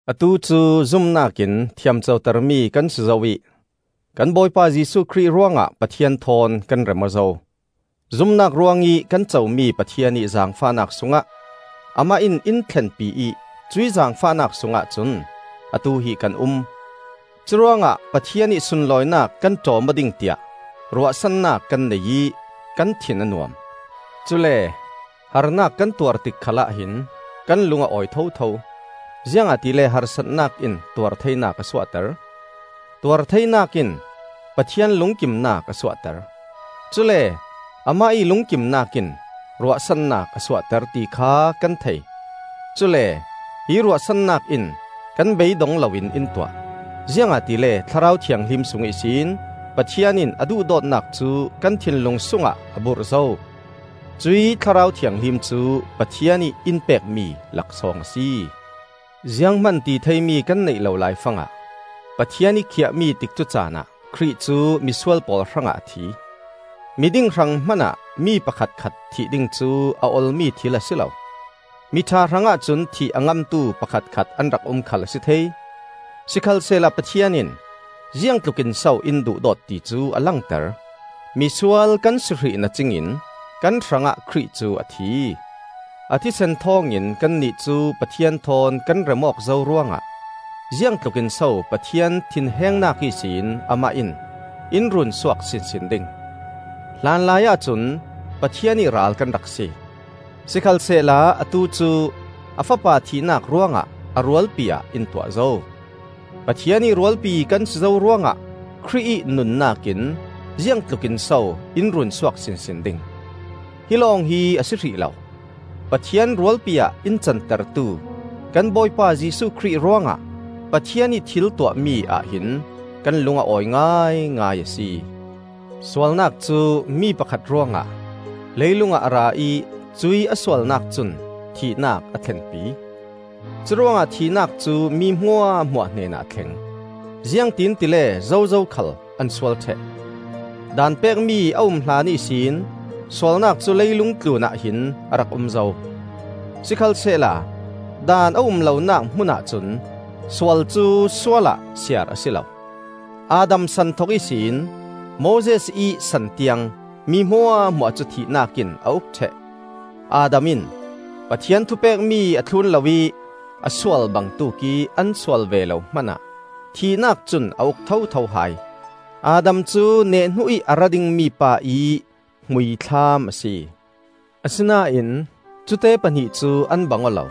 Atu cu zumnak in thiam cotermi kan si zo ih kan Bawipa Jesuh Khrih ruangah Pathian thawn kan rem aw zo. Zumnak ruangih kan comi Pathian ih zaangfahnak sungah Amah in in thlenpi ih cuih zaangfahnak sungah cun atu hi kan um. Curuangah Pathian ih sunlawinak kan ṭawm aw ding tiah ruahsannak kan nei ih kan thin a nuam. Cule harnak kan tuar tik khalah hin kan lung a awi thotho; ziangahtile harsatnak in tuartheinak a suahter, tuartheinak in Pathian lungkimnak a suahter, cule amah ih lungkimnak in ruahsannak a suahter, ti kha kan thei. Cule hi ruahsannak in kan bei dong loin in tuah, ziangahtile Thlarau Thianghlim sung ihsin Pathian in a duhdawtnak cu kan thinlung sungah a burh zo. Cuih Thlarau Thianghlim cu Pathian ih in pekmi laksawng a si. Zianghman ti theimi kan neih lo laifangah Pathian ih khiah mi tikcu caanah Khrih cu misual pawl hrangah a thi. Miding hrang hmanah mi pakhatkhat thih ding cu a olmi thil a si lo. Miṭha hrangah cun thih a ngamtu pakhatkhat an rak um khal a si thei. Sikhalsehla Pathian in ziangtlukinso in duhdawt ti cu a langter: misual kan si hrih na cingin kan hrangah Khrih cu a thi! A thisen thawng in kannih cu Pathian thawn kan rem awk zo ruangah ziangtlukinso Pathian thinhengnak ihsin Amah in in runsuak sinsin ding! Hlanlaiah cun Pathian ih ral kan rak si, sikhalsehla atu cu a Fapa thihnak ruangah a rualpi ah in tuah zo. Pathian ih rualpi kan si zo ruangah Khrih ih nunnak in ziangtlukin so in runsuak sinsin ding. Hi lawng hi a si hrih lo; Pathian rualpi ah in cantertu kan Bawipa Jesuh Khrih ruangah Pathian ih thil tuahmi ahhin kan lung a awi ngaingai a si. Sualnak cu mi pakhat ruangah leilungah a ra ih cuih a sualnak cun thihnak a thlenpi. Curuangah thihnak cu mi hmuahhmuah hnenah a thleng, ziangtin tile zozo khal an sual ṭheh. Daan pekmi a um hlan ihsin sualnak cu leilung tlunah hin a rak um zo; sikhalsehla Daan a um lonak hmunah cun sual cu sual ah siar a si lo. Adam san thok ihsin Moses ih san tiang mi hmuahhmuah cu thihnak in a uk ṭheh; Adam in Pathian thupekmi a thlun loih a sual bangtuk ih an sual ve lo hmanah thihnak cun a uk thotho hai. Adam cu nehhnu ih a ra dingmi pa ih hmuithlam a si. Asinain cute pahnih cu an bang aw lo,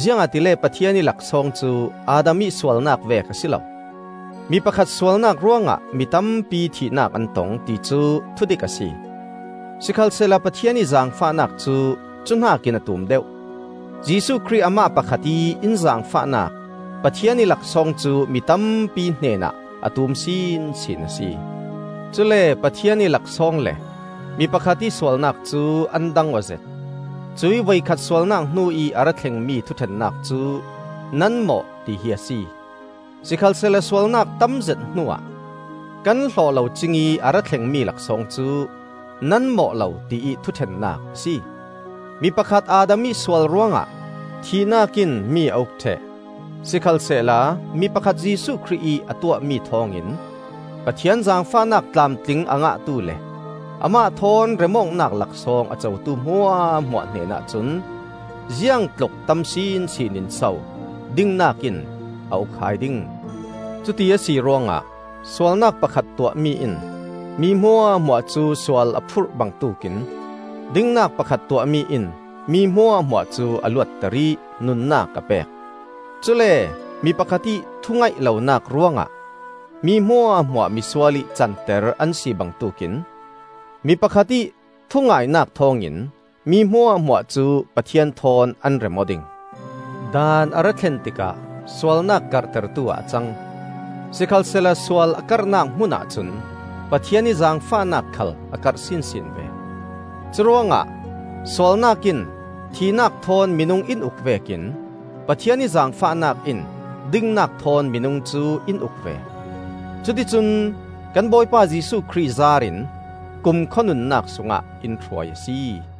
ziangahtile Pathian ih laksawng cu Adam ih sualnak vek a si lo. Mi pakhat sualnak ruangah mi tampi thihnak an tong, ti cu thudik a si. Sikhalsehla Pathian ih zaangfahnak cu cu hnakin a tum deuh; Jesuh Khrih amah pakhat ih in zaangfahnak Pathian ih laksawng cu mi tampi hnenah a tum sinsin a si. Cule Pathian ih laksawng le mi pakhat ih sualnak cu an dang aw zet. Cuih voikhat sualnak hnu ih a ra thlengmi thuṭhennak cu “Nan mawh,” tihi a si. Sikhalsehla sualnak tam zet hnuah kan hlawh lo cingih a ra thlengmi laksawng cu, “Nan mawh lo,” tiih thuṭhennak a si. Mi pakhat Adam ih sual ruangah thihnak in mi a uk ṭheh; sikhalsehla mi pakhat Jesuh Khrih ih a tuahmi thawngin Pathian zaangfahnak tlamtling a ngahtu le Amah thawn rem awknak laksawng a cotu hmuahhmuah hnenah cun ziangtluk tam sinsin in so dingnak in a uk hai ding. Cuti a si ruangah sualnak pakhat tuahmi in mi hmuahhmuah cu sual a phurh bangtuk in dingnak pakhat tuahmi in mi hmuahhmuah cu a luatter ih nunnak a pek. Cule mi pakhat ih thu-ngaih lonak ruangah mi hmuahhmuah misual ih canter an si bangtuk in mi pakhat ih thungainak thawngin mi hmuahhmuah cu Pathian thawn an rem aw ding. Daan a ra thlen tikah sualnak karhtertu ah a cang. Sikhalsehla sual a karhnak hmunah cun Pathian ih zaangfahnak khal a karh sinsin ve. Curuangah sualnak in thihnak thawn minung in uk vekin Pathian ih zaangfahnak in dingnak thawn minung cu in uk ve; cuticun kan Bawipa Jesuh Khrih zaar in kumkhua nunnak sungah in hruai a si.